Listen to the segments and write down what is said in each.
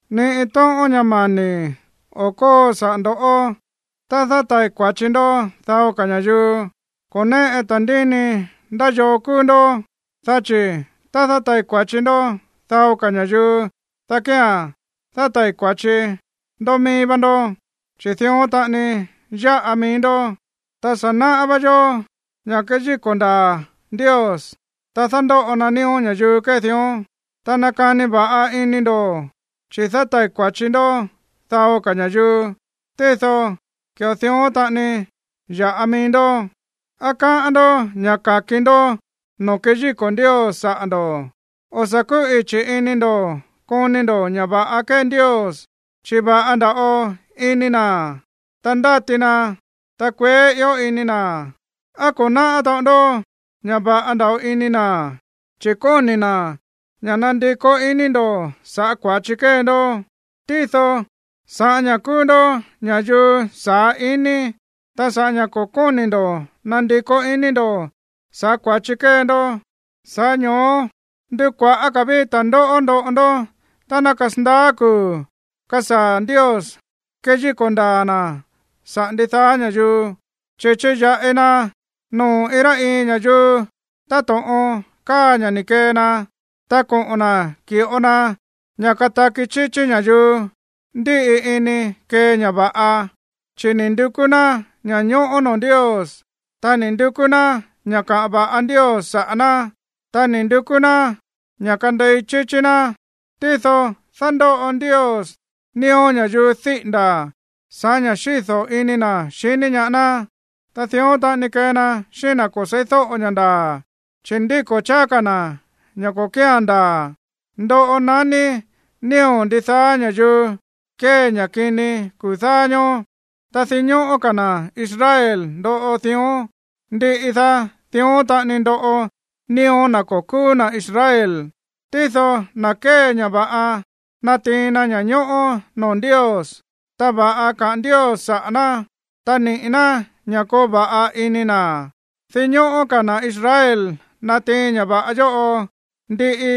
Ni iin tóꞌón ña̱ mani̱ o̱ kóo saꞌa̱ ndo̱ꞌó tá dátai̱ kua̱chi ndó dao ka̱ ña̱yuu. Ko̱ néꞌe ta̱ndíni ndá yoo kúú ndoꞌó, dá chi̱ tá dátai̱ kua̱chi ndó dao ka̱ ña̱yuu, dá kía̱n dátai̱ kua̱chi ndó mií vá ndó, chi̱ dión taꞌani yáꞌa mií ndó. Ta sa̱ náꞌá vá yó ña̱ kéyíko̱ ndaa̱ Ndios tá dándóꞌo na nío̱ ña̱yuu kée dión. Ta nakani va̱ꞌa ini ndo̱, chi̱ dátai̱ kua̱chi ndó dao ka̱ ña̱yuu, tído ki̱ꞌo dión taꞌani yáꞌa mií ndó. ¿Á káꞌán ndó ña̱ ka̱ki ndó noo̱ keyíko̱ Ndios saꞌa̱ ndo̱? O̱ sa̱ kúꞌichi̱ ini ndo̱ koni ndo̱ ña̱ va̱ꞌa kée Ndios, chi̱ va̱ꞌa nda̱ꞌo ini na̱, ta ndáti na, ta kueé ió ini na̱. ¿Á ko̱ náꞌá taꞌon ndó ña̱ va̱ꞌa nda̱ꞌo ini na̱, chi̱ kóni̱ na̱ ña̱ nandikó iní ndo̱ sa̱ꞌá kua̱chi kée ndó? Tído sa̱ꞌá ña̱ kúú ndó ña̱yuu saá ini, ta sa̱ꞌá ña̱ ko̱ kóni̱ ndo̱ nandikó ini ndo̱ sa̱ꞌá kua̱chi kée ndó, sa̱ꞌá ño̱ó ndukua̱ꞌá ka̱ ví ta̱ndóꞌó ndoꞌo ndó tá ná kasandaá kuu̱ kasaa̱ Ndios keyíko̱ ndaa̱ na̱ sa̱ꞌá ndidaá ña̱yuu, chi̱ chiya̱ꞌi na noo̱ iin rá iin ña̱yuu táto̱ꞌon káa ña̱ ni̱ kee na. Ta koꞌo̱n na̱ ki̱ꞌo na ña̱ kataki chíchí ña̱yuu ndíꞌi ini kée ña̱ va̱ꞌa, chi̱ ni̱ ndukú ná ña̱ñóꞌó noo̱ Ndios, ta ni̱ ndukú ná ña̱ kaꞌa̱n va̱ꞌa Ndios saꞌa̱ ná, ta ni̱ ndukú ná ña̱ kandei chíchí ná. Tído dándóꞌo Ndios nío̱ ña̱yuu díꞌi̱nda̱ sa̱ꞌá ña̱ xído̱ ini na̱ xiní ñaá ná, ta dión taꞌani kee na xíꞌín na̱ ko̱ se̱ídóꞌo ña̱ ndaa̱, chi̱ ndíko̱ cháá ka̱ na̱ ña̱ ko̱ kía̱n ndaa̱. Ndoꞌo naní nío̱ ndidaá ña̱yuu kée ña̱ kini kuu̱ dáá ñóó. Ta dinñóꞌó ka̱ na̱ Israel ndoꞌo dión, ndiꞌi daá, dión taꞌani ndoꞌo nío̱ na̱ ko̱ kúú na̱ Israel. Tído na̱ kée ña̱ va̱ꞌa natiin na ña̱ñóꞌó noo̱ Ndios, ta va̱ꞌa kaꞌa̱n Ndios saꞌa̱ ná, ta niꞌi̱ ná ña̱ koo va̱ꞌa ini na̱. Dinñóꞌó ka̱ na̱ Israel natiin ña̱ va̱ꞌa yóꞌo, ndiꞌi,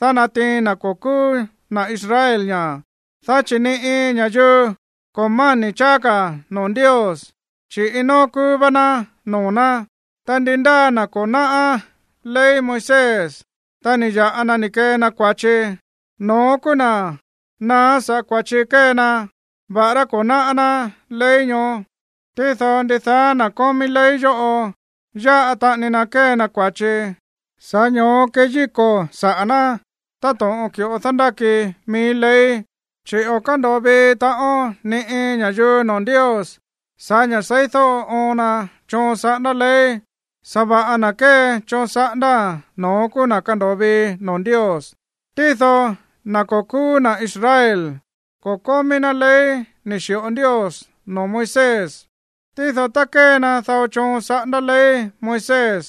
dá natiin na̱ ko̱ kúú na̱ Israel ña̱. Dá chi̱ ni iin ña̱yuu ko̱ máni̱ cháá ka̱ noo̱ Ndios, chi̱ iin nóó kúú vá ná noo̱ ná. Ta ndi ndáa na̱ ko̱ náꞌá ley Moisés, ta ni̱ ya̱ꞌa na ni̱ kee na kua̱chi, no̱ón kúú na̱ naá sa̱ꞌá kua̱chi kée na, va̱ꞌará ko̱ náꞌá ná ley ñoó. Tído ndidaá na̱ kómí ley yóꞌo yáꞌa taꞌani na kée na kua̱chi, sa̱ꞌá ño̱ó keyíko̱ saꞌa̱ ná táto̱ꞌon ki̱ꞌo dándáki mií ley. Chi̱ o̱ kándo̱o vii taꞌon ni iin ña̱yuu noo̱ Ndios sa̱ꞌá ña̱ seídóꞌo oon na choon saꞌándá ley. Sa̱va̱ꞌa na̱ kée choon saꞌándáa̱n, no̱ón kúú na̱ kando̱o vii noo̱ Ndios. Tído na̱ ko̱ kúú na̱ Israel, ko̱ kómí ná ley ni̱ xi̱ꞌo Ndios noo̱ Moisés. Tído tá kée na dao choon saꞌándá ley Moisés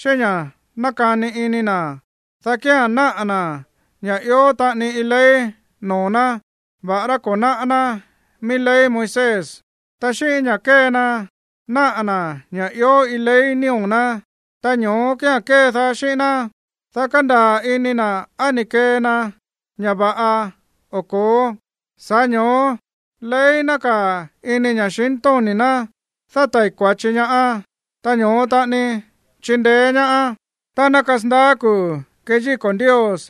xíꞌín ña̱ nákani ini na̱, dá kía̱n náꞌa̱ na̱ ña̱ ió taꞌani iin ley noo̱ ná, va̱ꞌará ko̱ náꞌá ná mií ley Moisés. Ta xíꞌín ña̱ kée na náꞌa̱ na̱ ña̱ ió iin ley nío̱ ná, ta ñoó kía̱n kédaá xíꞌín ná, dá kandaa̱ ini na̱ á ni̱ kee na ña̱ va̱ꞌa o ko̱ó. Sa̱ꞌá ño̱ó ley nákaa̱ ini ña̱xintóni̱ ná dátai̱ kua̱chi ñaá, ta ño̱ó taꞌani chindeé ñaá tá ná kasandaá kuu̱ keyíko̱ Ndios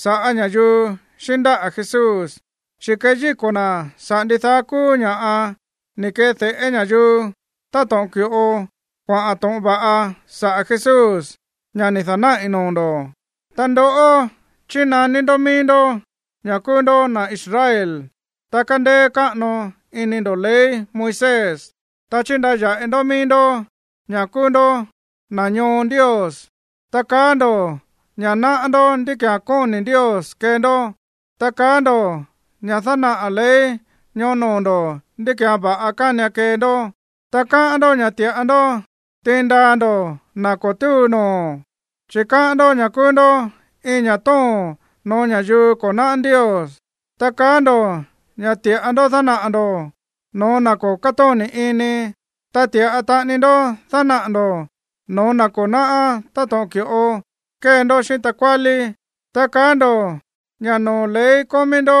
sa̱ꞌá ña̱yuu xíꞌín ndáꞌa̱ Jesús, chi̱ keyíko̱ na̱ saꞌa̱ ndidaá kúú ña̱ꞌa ni̱ ke̱de̱ꞌé ña̱yuu táto̱ꞌon ki̱ꞌo kuaꞌa̱n to̱ꞌon va̱ꞌa saꞌa̱ Jesús, ña̱ ni̱ da̱náꞌi̱ noo̱ ndo̱. Ta ndoꞌó, chínaní ndó mií ndó ña̱ kúú ndó na̱ Israel, ta kándéé káꞌano ini ndo̱ ley Moisés. Ta chíndaya̱ꞌi ndó mií ndó ña̱ kúú ndó na̱ ñoo Ndios. Ta kaá ndo̱ ña̱ náꞌá ndó ndí ki̱án kóni̱ Ndios kee ndó, ta kaá ndo̱ ña̱ dánaꞌa̱ ley ñoó noo̱ ndo̱ ndí ki̱án va̱ꞌa kánian kee ndó. Ta káꞌán ndó ña̱ ti̱ꞌa ndó tiin ndaa ndo̱ na̱ ko̱ túu noo̱, chi̱ káꞌán ndó ña̱ kúú ndó iin ña̱ tóo̱n no̱ó ña̱yuu ko̱ náꞌá Ndios. Ta kaá ndo̱ ña̱ ti̱ꞌa ndó dánaꞌa̱ ndo̱ no̱ó na̱ ko̱ kátóni̱ iní, ta ti̱ꞌa taꞌani ndó dánaꞌa̱ ndo̱ no̱ó na̱ ko̱ náꞌá táto̱ꞌon ki̱ꞌo kée ndó xíꞌín takuálí. Ta kaá ndo̱ ña̱ noo̱ ley kómí ndó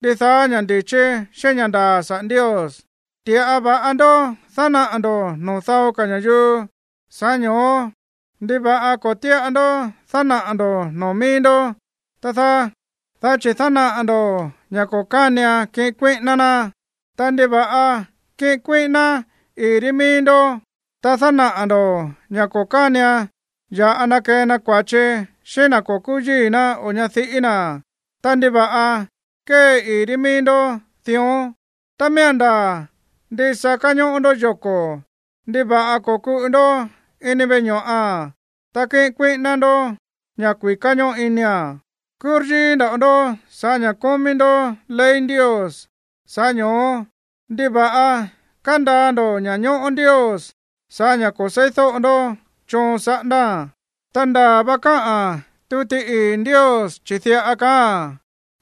ndidaá ña̱ ndi̱chí xíꞌín ña̱ ndaa̱ saꞌa̱ Ndios. Ti̱ꞌa va̱ꞌa ndó dánaꞌa̱ ndo̱ noo̱ dao ka̱ ña̱yuu, sa̱ꞌá ño̱ó, ¿ndiva̱ꞌa ko̱ tíꞌa ndó dánaꞌa̱ ndo̱ noo̱ míí ndó, tá dáá? Dá chi̱ dánaꞌa̱ ndo̱ ña̱ ko̱ kánian kiꞌin kuíꞌíná ná. Ta, ¿ndiva̱ꞌa kíꞌin kuíꞌíná ii̱ ri míí ndó? Ta dánaꞌa̱ ndo̱ ña̱ ko̱ kánian ya̱ꞌa na kee na kua̱chi xíꞌín na̱ ko̱ kúú yíi̱ ná o ñadiꞌí na̱. Ta, ¿ndiva̱ꞌa kée ii̱ ri mií ndó dión? Tá miía̱n ndaa̱ ndisa káñóꞌó ndó yoko̱, ¿ndiva̱ꞌa ko̱kuꞌu ndó ini veꞌe ño̱ꞌa̱n, ta kíꞌin kuíꞌíná ndó ña̱ kui̱ká ñóꞌo inia̱n? Kúryíí nda̱ꞌo ndó sa̱ꞌá ña̱ kómí ndó ley Ndios, sa̱ꞌá ño̱ó, ¿ndiva̱ꞌa kándaa ndo̱ ña̱ñóꞌó Ndios sa̱ꞌá ña̱ ko̱ se̱ídóꞌo ndó choon saꞌándáa̱n? Ta ndaa̱ va káꞌa̱n tuti ii̱ Ndios, chi̱ diꞌa kaáa̱n: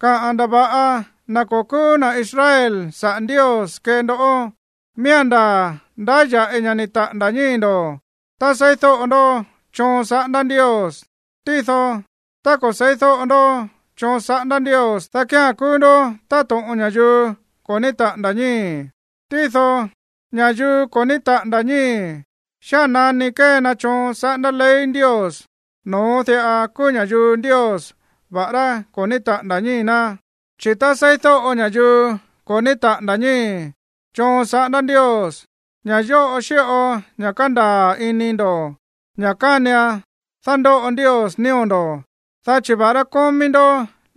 “Káꞌa̱n ndava̱ꞌa na̱ ko̱ kúú na̱ Israel saꞌa̱ Ndios kée ndoꞌó.” Miía̱n ndaa̱ ndáya̱ꞌi ña̱ ni̱ taꞌa̱nda̱ ñíi̱ ndo̱ tá seídóꞌo ndoꞌó choon saꞌándá Ndios. Tído tá ko̱ se̱ídóꞌo ndó choon saꞌándá Ndios, dá kía̱n kúú ndó táto̱ꞌon ña̱yuu ko̱ ní taꞌa̱nda̱ ñíi̱. Tído ña̱yuu ko̱ ní taꞌa̱nda̱ ñíi̱, xía̱n nani kée na choon saꞌándá ley Ndios, no̱ón diꞌa kúú ña̱yuu Ndios, va̱ꞌará ko̱ ní taꞌa̱nda̱ ñíi̱ ná. Chi̱ tá seídóꞌo ña̱yuu ko̱ ní taꞌa̱nda̱ ñíi̱ choon saꞌándá Ndios, ña̱ yóꞌo xíꞌo ña̱ kándaa̱ ini ndo̱ ña̱ kánian dándóꞌo Ndios nío̱ ndo̱, dá chi̱ va̱ꞌará kómí ndó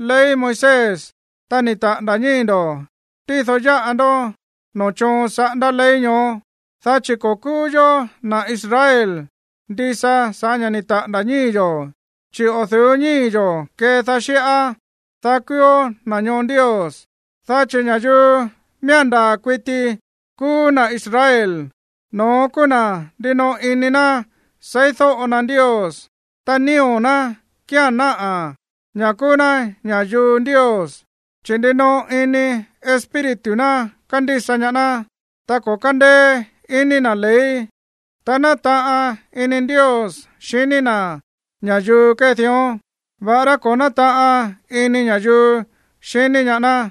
ley Moisés, ta ni̱ taꞌa̱nda̱ ñíi̱ ndo̱, tído yáꞌa ndó noo̱ choon saꞌándá ley ñoó. Dá chi̱ ko̱ kúú yó na̱ Israel ndisa sa̱ꞌá ña̱ ni̱ taꞌa̱nda̱ ñíi̱ yo̱, chi̱ o̱ du̱ú ñíi̱ yo̱ kédaá xíꞌá, dá kúúó na̱ ñoo Ndios. Dá chi̱ ña̱yuu miía̱n ndaa̱ kuiti kúú na̱ Israel, no̱ón kúú na̱ ndinoꞌo iní na̱ seídóꞌo na Ndios. Ta nío̱ na̱ kía̱n náꞌa̱ ña̱ kúú ná ña̱yuu Ndios, chi̱ ndinoꞌo ini espíritu ná kándísa ñaá ná, ta ko̱ kándéé ini na̱ ley. Ta nátaꞌan ini Ndios xiní na̱ ña̱yuu kée dión, va̱ꞌará ko̱ nátaꞌan ini ña̱yuu xiní ñaá ná.